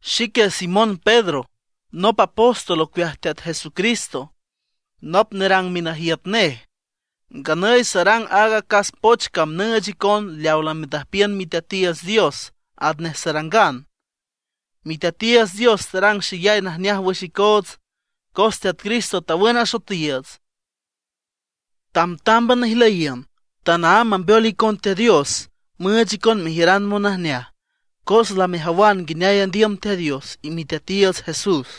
Xique Simón Pedro nop apóstol ocueaj Teat Jesucristo, nop nerang minajiüt nej. Nganüy sarang aaga acas poch cam nüüch icon leawa lamendüjpiün Miteatiiüts Dios atnej sarangan. Miteatiiüts Dios tarang xeyay najneaj wüx icoots, cos Teat Cristo tawün asoetiiüts. Tambtámban ijlüyiün. Tanaámb mambeol icon Teat Dios, müüch icon mejiüran monajneaj, cos lamejawan nguineay andiüm Teat Dios y Miteatiiüts Jesús.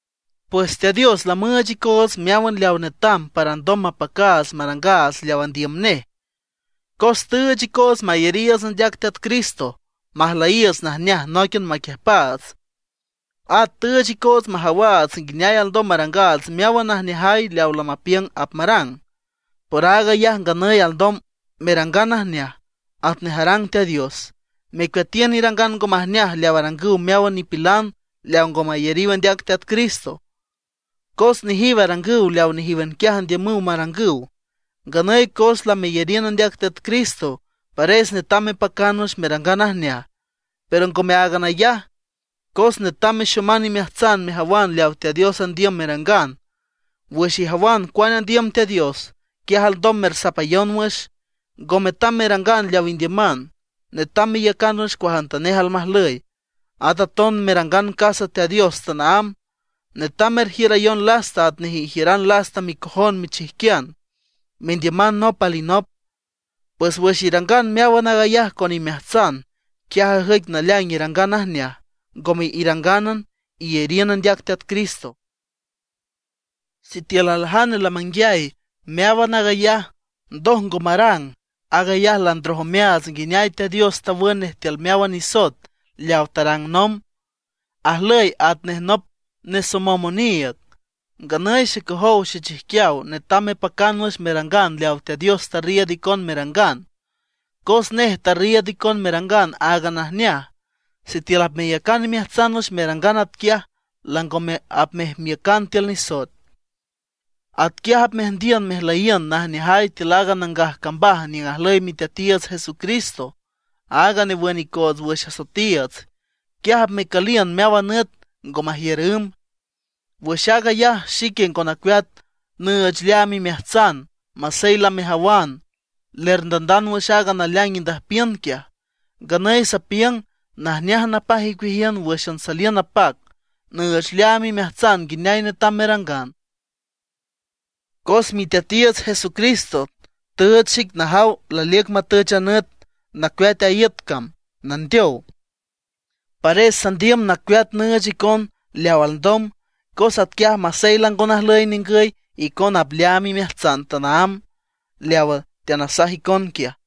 Pues Teat Dios lamüüch icoots meáwan leaw netam para alndom mapacaats marangaats leaw andiüm nej, cos tüüch icoots mayariiüts andeac Teat Cristo, majlüyiiüts najneaj nóiquian maquiüjpaats. At tüüch icoots majawaats nguineay alndom marang meáwan najneajay leaw lamapiüng apmarang. Por aag ayaj nganüy alndom merangan najneaj, atnej arang Teat Dios, mecueatiün irangan ngo majneaj leaw arangüw meáwan nipilan leaw ngo mayariw andeac Teat Cristo, cos nejiw arangüw leaw nejíwan quiaj andiümüw marangüw. Nganüy cos lameyariün andeac Teat Cristo, pares netam mepacan wüx merangan najneaj. Pero ngome áagan ayaj, cos netam mexoman imeajtsan mejawan leawa Teat Dios andiüm merangan. Wüx ijawan cuane andiüm Teat Dios, quiaj alndom mersapayon wüx, ngo metam merangan leaw indiüman. Netam meiücan wüx cuajantanej almajlüy, at aton merangan casa Teat Dios tanaámb. Netam merjiürayon lasta atnej ijiüran lasta micojon michijquian, mendiüman nop alinop. Pues wüx irangan meáwan aag ayaj con imeajtsan, quiaj ajüic naleaing irangan najneaj, ngome irangánan iyariün andeac Teat Cristo. Sitiül aljane lamanguiay meáwan aag ayaj, ndoj ngo marang, aag ayaj landroj omeaats nguineay Teat Dios tawün nej tiül meáwan nisoet leawa tarang nomb; ajlüy atnej nop nesomom oniiüg. Nganüy xecojow xechijquiaw, netam mepacan wüx merangan leawa Teat Dios tarriiüd icon merangan, cos nej tarriiüd icon merangan áagan najneaj. Sitiül apmeyacan imeajtsan wüx merangan atquiaj, langome apmejmiücan tiül nisoet. Atquiaj apmeajndiün mejmeliün najneajay tiül aaga nangaj cambaj niüng ajlüy Miteatiiüts Jesucristo, aaga newün icoots wüx asoetiiüts. Quiaj apmecüliün meáwan nüt, ngo majiür ümb. Wüx aag ayaj, xique ngo nacueat nüüch leaam imeajtsan, masey lamejawan, lerndandand wüx aaga naleaing indüjpiün quiaj. Nganüy sapiüng najneaj napaj icueajiün wǘxan saliün napac, nüüch leaam imeajtsan nguineay netam merangan; cos Miteatiiüts Jesucristo tüüch xic najaw laliüc matüch a nüt nacueat a iüt cam, nandeow. Pares sandiüm nacueat nüüch icon leaw alndom, cos atquiaj masey lango najlüy ningüy, icona apleaam imeajtsan tanaámb leawa teanasaj icon quiaj.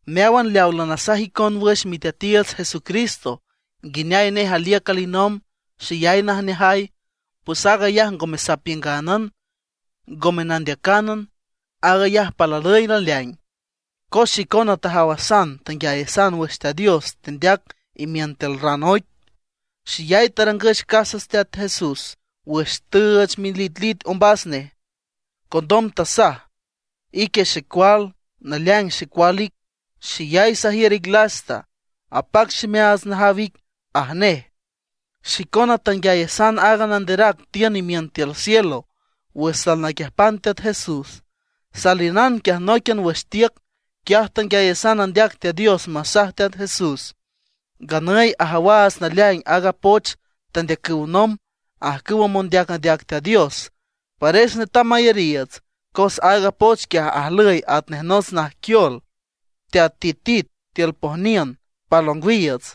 Meáwan leawa lanasajan icon wüx Miteatiiüts Jesucristo, nguineay nej aliüc alinomb xeyay najneajay, pues aag ayaj ngome sapiüngánan, ngome nandeacánan; aag ayaj palüy naleaing. Cos xicona tajawasan tanguiayasan wüx Teat Dios tendeac imiün tiül raan oic, xeyay tarangüch casa Teat Jesús wüx tüüch militlit ombas nej. Condom tasaj: “Ique xecual, naleaing xecual ic, xeyay sajiür ic lasta, apac ximeaats najaw ic”, aj nej. Xicona tanguiayasan aaga nanderac tiün imiün tiül cielo wüx salnaquiüjpan Teat Jesús, saliünan quiaj nóiquian wüx tiüc. Quiaj tanguiayasan andeac Teat Dios masaj Teat Jesús. Nganüy ajawaats naleaing aaga poch tandeacüw nomb ajcüwa mondeac andeac Teat Dios. Pares netam mayariiüts, cos aaga poch quiaj ajlüy atnej nots najquiol teatitit tiül pojniün pal ongwiiüts,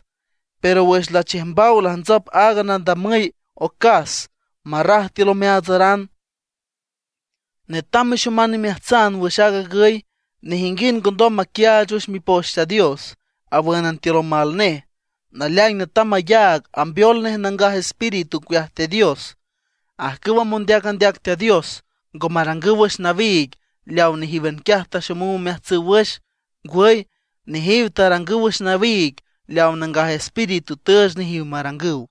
pero wüx lachiüjmbaw lajntsop aaga nadamüy ocas marraj tiül omeaatsaran. Netam mexoman imeajtsan wüx aag agüy: nejinguind ngo ndom maquiaach wüx Mipoch Teat Dios, awǘnan tiül omal nej; naleaing netam mayaag ambeol nej Nangaj Espíritu ocueaj Teat Dios. Ajcüwa mondeac andeac Teat Dios, ngo marangüw wüx nawiig leawa nejíwan quiaj taxomüw omeajtsüw wüx. Ngwüy, nejiw tarangüw wüx nawiig leawa Nangaj Espíritu tüüch nejiw marangüw.